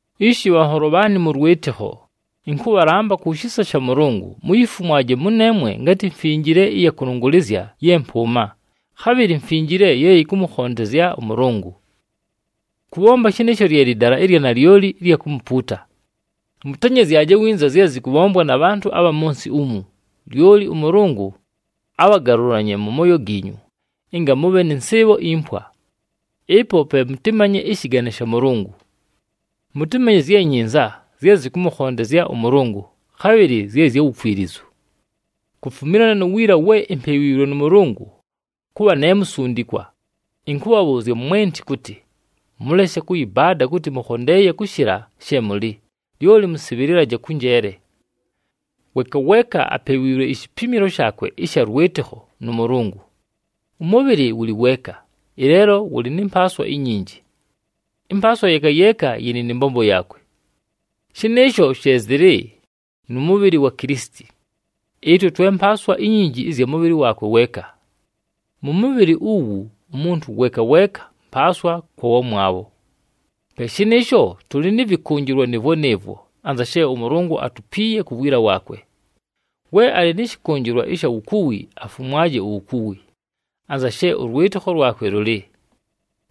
Ishi bhanholo bhaanɨ mʉ lwɨtɨkho, ɨnkʉbhalamba ku shisa sha Mʉlʉngʉ, muyifumwaje mʉneemwe ngatɨ mfinjile ɨya kʉlʉngʉlɨzya ye mpʉʉma, khabhɨlɨ mfinjile ye yɨkʉmʉkhondezya ʉMʉlʉngʉ. Kʉbhomba shɨnɨɨsho lye lɨdala ɨlya nalyoli ɨlya kumupuuta. Mʉtenyezyaje winza zye zɨkʉbhombwa na bhantʉ abha mʉ nsɨ umu, lyoli ʉMʉlʉngʉ abhagalʉlanye mʉ mooyo giinyu, ɨnga mʉbhe nɨ nsɨɨbho impwa. Ɨpo pe mʉtɨmanye ɨshɨgane sha Mʉlʉngʉ. Mʉtɨmanye zye nyinza, zye zɨkʉmʉkhondezya ʉMʉlʉngʉ, khabhɨlɨ zye zya wukwilizu. Kufumilana nu wiila we impewiilwe nʉ Mʉlʉngʉ kʉbha ne musundikwa, ɨnkʉbhabhʉʉzya mwenti kʉtɨ: mʉleshe kʉyɨbaada kʉtɨ mʉkhondeeye kʉshɨla she mʉlɨ, lyoli mʉsɨbhɨlɨlaje kʉ njeele. Weeka weeka apewiilwe ishipimilo shaakwe ɨsha lwɨtɨkho nʉ Mʉlʉngʉ. Ʉmʉbhɨlɨ wʉlɨ weeka, ɨleelo wʉlɨ nɨ mpaaswa inyinji. Ɨmpaaswa yeeka yeeka yɨlɨ nɨ mbombo yaakwe. Shɨnɨɨsho she zɨlɨ nʉ mʉbhɨlɨ wa Kilisiti. Ɨtwe twe mpaaswa inyinji ɨzya mʉbhɨlɨ waakwe weeka. Mʉ mʉbhɨlɨ uwu, umuntu weeka weeka mpaaswa kwa wamwabho. Pe shɨnɨɨsho, tʉlɨ nɨ vɨkʉnjɨlwa nɨɨvwo nɨɨvwo anza she ʉMʉlʉngʉ atupiiye ku wiila waakwe. We alɨ nɨ shɨkʉnjɨlwa ɨsha wukuwi, afumwaje uwukuwi, anza she ʉlwɨtɨkho lwakwe lʉlɨ.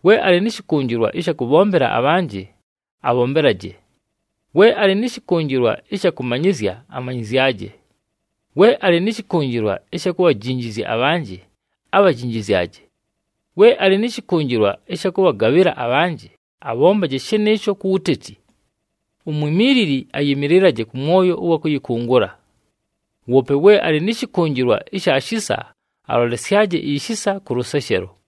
We alɨ nɨ shɨkʉnjɨlwa ɨsha kʉbhombela abhanjɨ, abhombelaje. We alɨ nɨ shɨkʉnjɨlwa ɨsha kʉmanyɨzya, amanyɨzyaje. We alɨ nɨ shɨkʉnjɨlwa ɨsha kubhajinjizya abhanjɨ, abhajinjizyaje. We alɨ nɨ shɨkʉnjɨlwa ɨsha kʉbhagabhɨla abhanjɨ, abhombaje shɨnɨɨsho ku wuteti. Umwimiilili ayɨmɨlɨlaje kʉ mwoyo ʉwa kʉyɨkʉngʉla. Woope we alɨ nɨ shɨkʉnjɨlwa ɨsha shisa, alolesyaje ishisa kʉ lʉseshelo.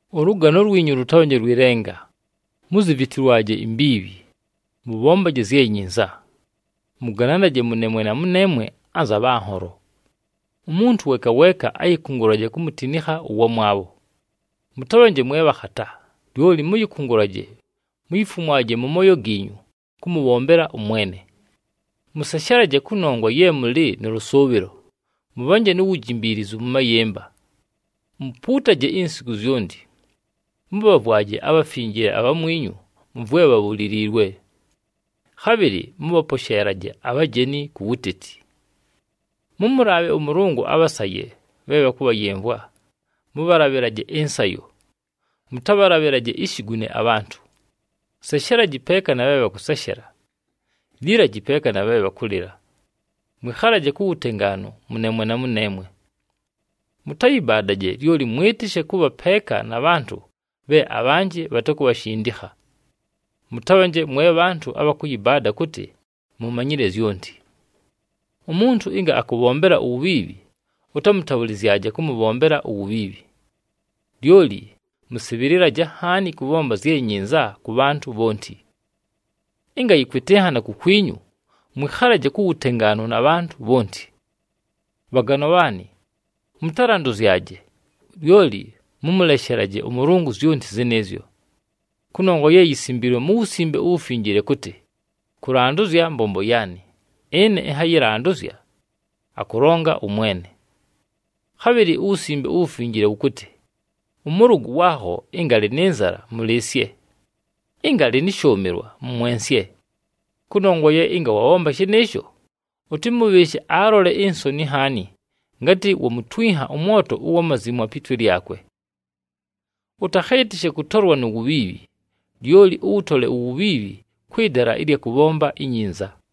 Ʉlʉgano lwinyu lʉtabhanje lwɨ lenga, muzivitilwaje imbiibhi, mʉbhombaje zye nyinza. Mʉgananaje mʉneemwe na mʉneemwe anza bhanholo. Umuntu weeka weeka ayɨkʉngʉlaje kumutinikha ʉwamwabho. Mʉtabhanje mwe bhakhata, lyoli mʉyɨkʉngʉlaje, muyifumwaje mʉ mooyo giinyu kʉmʉbhombela ʉMwene. Mʉseshelaje kʉnongwa ye mʉlɨ nʉ lʉsʉʉbhɨlo, mʉbhanje nu wujimbiilizu mʉ mayɨmba. Mupuutaje insiku zyonti. Mʉbhavwaje abhafinjile abhamwinyu mʉ vwe bhabhuliliilwe. Khabhɨlɨ mʉbhaposheelaje abhajeni ku wuteti. Mʉmʉlaabhe ʉMʉlʉngʉ abhasaye bhe bhakʉbhayɨmvwa, mʉbhalabhɨlaje ɨnsayo, mʉtabhalabhɨlaje ishigune abhantʉ. Seshelaji peeka na bhe bhakʉseshela. Lilaji peeka na bhe bhakʉlɨla. Mwɨkhalaje ku wutengaanu mʉneemwe na mʉneemwe. Mʉtayɨbaadaje, lyoli mwɨtɨshe kʉbha peeka na bhantʉ bhe abhanjɨ bhatakubhashindikha. Mʉtabhanje mwe bhantʉ abha kʉyɨbaada kʉtɨ mumanyile zyonti. Umuntu ɨnga akʉbhombela uwubhiibhi ʉtamʉtabhʉlɨzyaje kʉmʉbhombela uwubhiibhi. Lyoli mʉsɨbhɨlɨlaje nhaani kʉbhomba zye nyinza kʉ bhantʉ bhonti. Ɨnga yɨkwɨtɨnhana kukwinyu, mwɨkhalaje ku wutengaanu na bhantʉ bhonti. Bhaganwa bhaanɨ, mʉtalandʉzyaje, lyoli mʉmʉleshelaje ʉMʉlʉngʉ zyonti zɨnɨɨzyo. Kʉnongwa ye yisimbiilwe mu Wusimbe uWufinjile kʉtɨ, “Kʉlandʉzya mbombo yaanɨ, ɨne ɨnhayɨlandʉzya, akʉlonga ʉMwene.” Khabhɨlɨ uWusimbe uWufinjile wʉkʉtɨ, “Ʉmʉlʉgʉ waakho ɨnga alɨ nɨ nzala, mʉlɨɨsye. Ɨnga alɨ nɨ shʉʉmɨlwa, mʉmwensye. Kʉnongwa ye ɨnga wabhomba shɨnɨɨsho, ʉtɨmʉbhɨɨshe alole insoni nhaani ngatɨ wamutwinha ʉmwoto ʉwa mazimwa pi twe lyakwe.” Ʉtakhɨɨtɨshe kʉtolwa nu wubhiibhi, lyoli ʉwʉtole uwubhiibhi kwɨ dala ɨlya kʉbhomba inyinza.